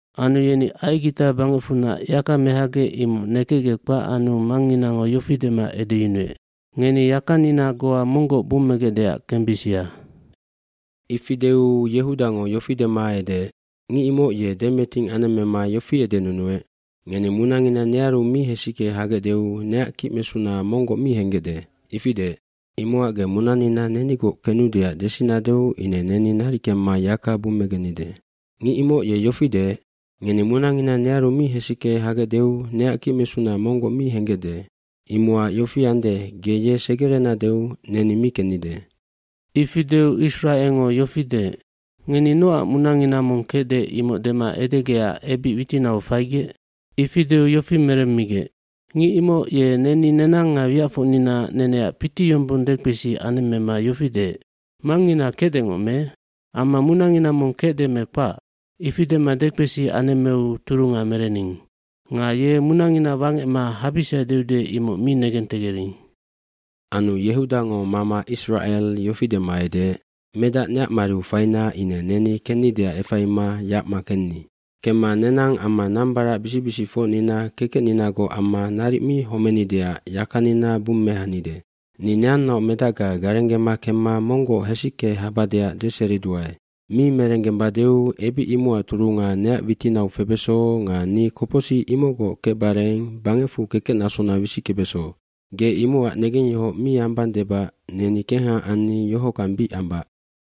Anu yeni Aigita bangecfunac yaka mehagec imoc nekecgec kpac anu mangnginango yofi dema edeyunuec, “Ngeni yakanina goa monggoc bummegecdeac kembisia.” aIfi deu Yehudango yofi dema edeec, “Ngic imoc ye demeting anemmema yofi edenunuec, ‘Ngeni munangina nearu mi hesicke hagecdeu neac kicmesuna monggoc mi henggecde.’ Ifi deec. Imocac ge munanina nenigoc kenudeac desinadeu ine neni naric kemma yaka bummegennide. Ngic imoc ye yofi deec, ‘Ngeni munangina nearu mi hesicke hagecdeu neac kicmesuna monggoc mi henggecde.’ Imocac yofi ande ge ye segerenadeu neni mi kennide.” Ifi deu Isracelngo yofi deec, “Ngeni nocac munangina mong kecde imoc dema edegecac ebic witinau faigec?” Ifi deu yofi meremmigec, “Ngic imoc ye neni nenang nga wiacfocnina neneac piti yombong dekpesi anemmema yofi deec, ‘Mangngina kecdengoc me? Amma munangina mong kecde me kpac? Ifi dema dekpesi anemmeu turunga merening. Nga ye munangina wangecma habisia deude imoc mi negentegering.’” Anu Yehudango mama Isracel yofi dema edeec, “Medac neac mariu faina ine neni kennideac efaima yacma kenni. Kemma nenang amma nambaracbisic bisicfocnina kekecninagoc amma naric mi homenideac yakanina bummehanide. Ni neannaoc medacga garenggema kemma monggoc hesicke habadeac deseriduae. Mi merenggembadeu ebic imocac turunga neac witinau febeso nga ni kopocsic imocgoc kecbareng bangecfu kekecnasona wisickebeso. Ge imocac negengyohoc mi ambang debac neni kengha anni yohockang bic ambac.”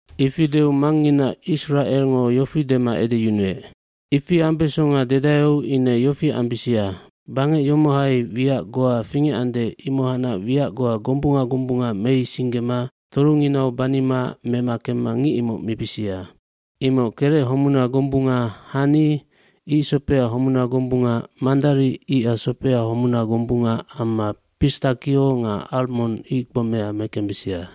Ifi deu mangngina Isracelngo yofi dema edeyunuec, “Ifi ambesonga dedaeu ine yofi ambisia, bangec yomohai wiac goa fingecande imohacnac wiac goa gombunga gombunga meisinggema torunginau banima mema kemma ngic imoc mibisia. Imoc kerec homuna gombunga, hani,b icsopea homuna gombunga, mandari icac sopea homuna gombunga amma pistakio nga almond icgbomea mekembisia.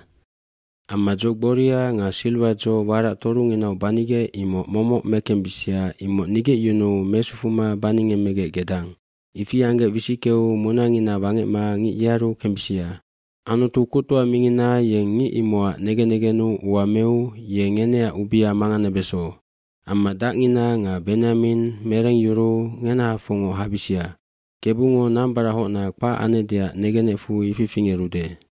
Amma dzo gboria nga silwadzo warac torunginau banigec imoc momoc mekembisia imoc nigecyunuu mesufuma baningemmegec gedang. Ifi anggec wisickeu munangina wangecma ngic yearu kembisia. Anutu Kuctoa mingina yeng ngic imocac negen negennu ua meu ye ngeneac ubia manganebeso. Amma dacngina nga Benyamin merengyuruu ngenahafocngoc habisia. Kebungo nambarachocna kpac anecdeac negenecfu ifi fingerude.”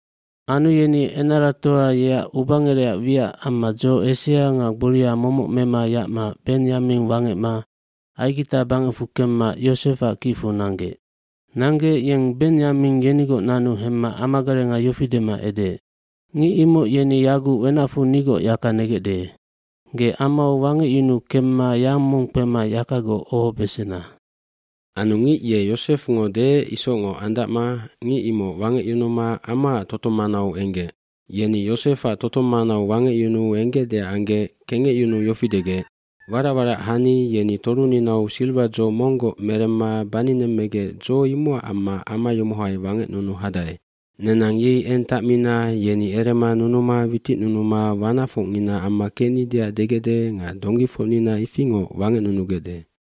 Anu yeni enaratoa yeac ubangerecac wiac amma dzo esea nga gboria momoc mema yacma Benyamin wangecma Aigita bangecfu kemma Yosefac kicfu nanggec. Nanggec yeng Benyaming yenigoc nanu hemma amagarenga yofi dema edeec, “Ngic imoc yeni yaguc wenacfu nigoc yaka negecde. Ge amau wangecyunu kemma yang mong kpema yakagoc ohobesena.” Anu ngic ye Yosefngo deec isocngoc andacma ngic imoc wangecyunuma amaac totong manau enggec. Yeni Yosefac totong manau wangecyunu enggecdeac anggec kengecyunuu yofi degec, “Warac warac hani yeni toruninau silwadzo monggoc meremma baninemmegec dzo imocac amma ama yomohai wangecnunu hadae. Nenang yei eng tacmina yeni erema nunuma witicnunuma wanacfocngina amma kecnideac degecde nga donggifocnina ifingoc wangecnunugecde.”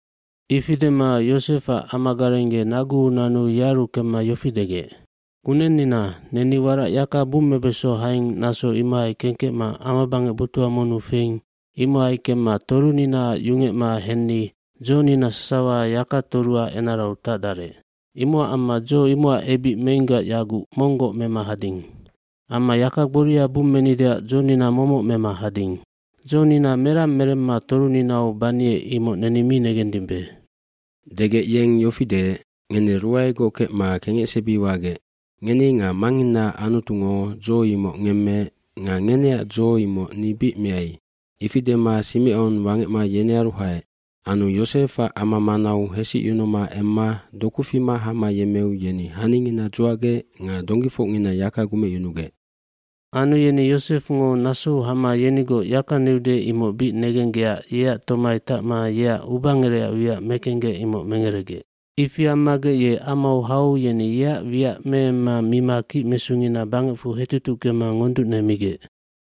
Ifi dema Yosefac amagareng ye naguu nanu yearu kemma yofi degec, “Kunennina neni warac yaka bummebeso haing naso imohai kengkecma amabangec botuha monnu feing imohai kemma torunina yungecma henni dzonina sasawa yakatoruac enarau tacdarec. Imocac amma dzo imocac ebic meinggac yaguc monggoc mema hading. Amma yaka gboria bummenideac dzonina momoc mema hading. Dzonina merang meremma toruninau baniec imoc neni mi negendimbe.” cDegec yeng yofi deec, “Ngeni ruaegoc kecma kengecsebi wagec. Ngeni nga mangnginaac Anutungo dzo imoc ngemmeec nga ngeneac dzo imoc ni bic meai.” Ifi dema Simecon wangecma yenearu haec. Anu Yosefac ama manau hesicyunuma emma doku fima hama yemmeu yeni haningina dzuacgec nga donggifocngina yaka gumecyunugec. dAnu yeni Yosefngo nasou hama yenigoc yaka neude imoc bic negenggecac yeac tomai tacma yeac ubangerecac wiac mekenggec imoc mengeregec. Ifi ammagec ye amau hau yeni yeac wiac meemma mima kicmesungina bangecfu hetutuckema ngonducnemigec.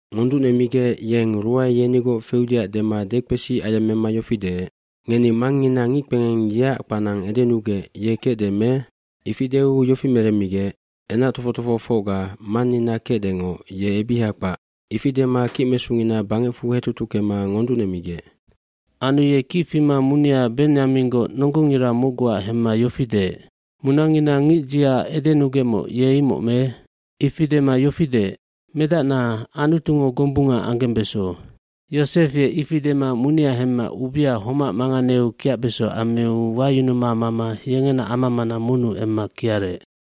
Ngonducnemigec yeng ruae yenigoc feudeac dema dekpesi ayemmema yofi deec, “Ngeni mangngina ngickpengeng yeac hanahema edenugec ye kecde me?” Ifi deu yofi meremmigec, “Enac tofoc tofohofocga mannina kecdengoc ye ebiha kpac.” Ifi dema kicmesungina bangecfu hetutuckema ngonducnemigec. Anu ye kic fima munia Benyaminggoc nonggongira mocguac hemma yofi deec, “Munangina ngicdziaac edenugecmoc ye imoc me?” Ifi dema yofi deec, “Medacna, Anutungo gombunga anggembeso.” Yosef ye ifi dema munia hemma ubia homac manganeu kiacbeso ammiu wayunuma mama yengena ama mana monnu emma kiarec.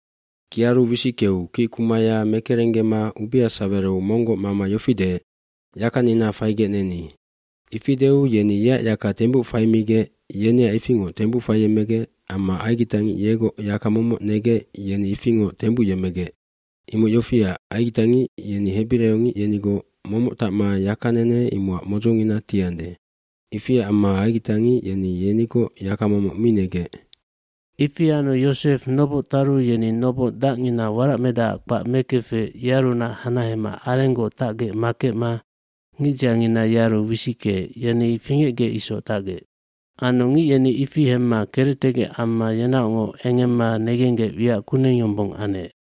Kiaru wisickeu kickumaya mekerenggema ubia sawereu monggoc mama yofi deec, “Yakanina faigec neni.” eIfi deu yeni yeac yaka tembuc faimigec yeneac ifingoc tembuc faiyemmegec amma aigitangic yegoc yaka momoc negec yeni ifingoc tembuc yemmegec. Imoc yofiac, aigitangic yeni hebiraiongic yenigoc momoc tacma yakanene imocac modzongina tiande. Ifiac amma aigitangic yeni yenigoc yaka momoc mi negec. Ifi anu Yosef noboc taru yeni noboc dacngina waracmedacac kpac mekefec yearunac hanahema arenggoc tacgec makecma ngicdziangina yearu wisickeec yeni fingecgec isoc tacgec. Anu ngic yeni ifi hemma kerectegec amma yenaocngoc engemma negenggec wiac kuneng yombong anec.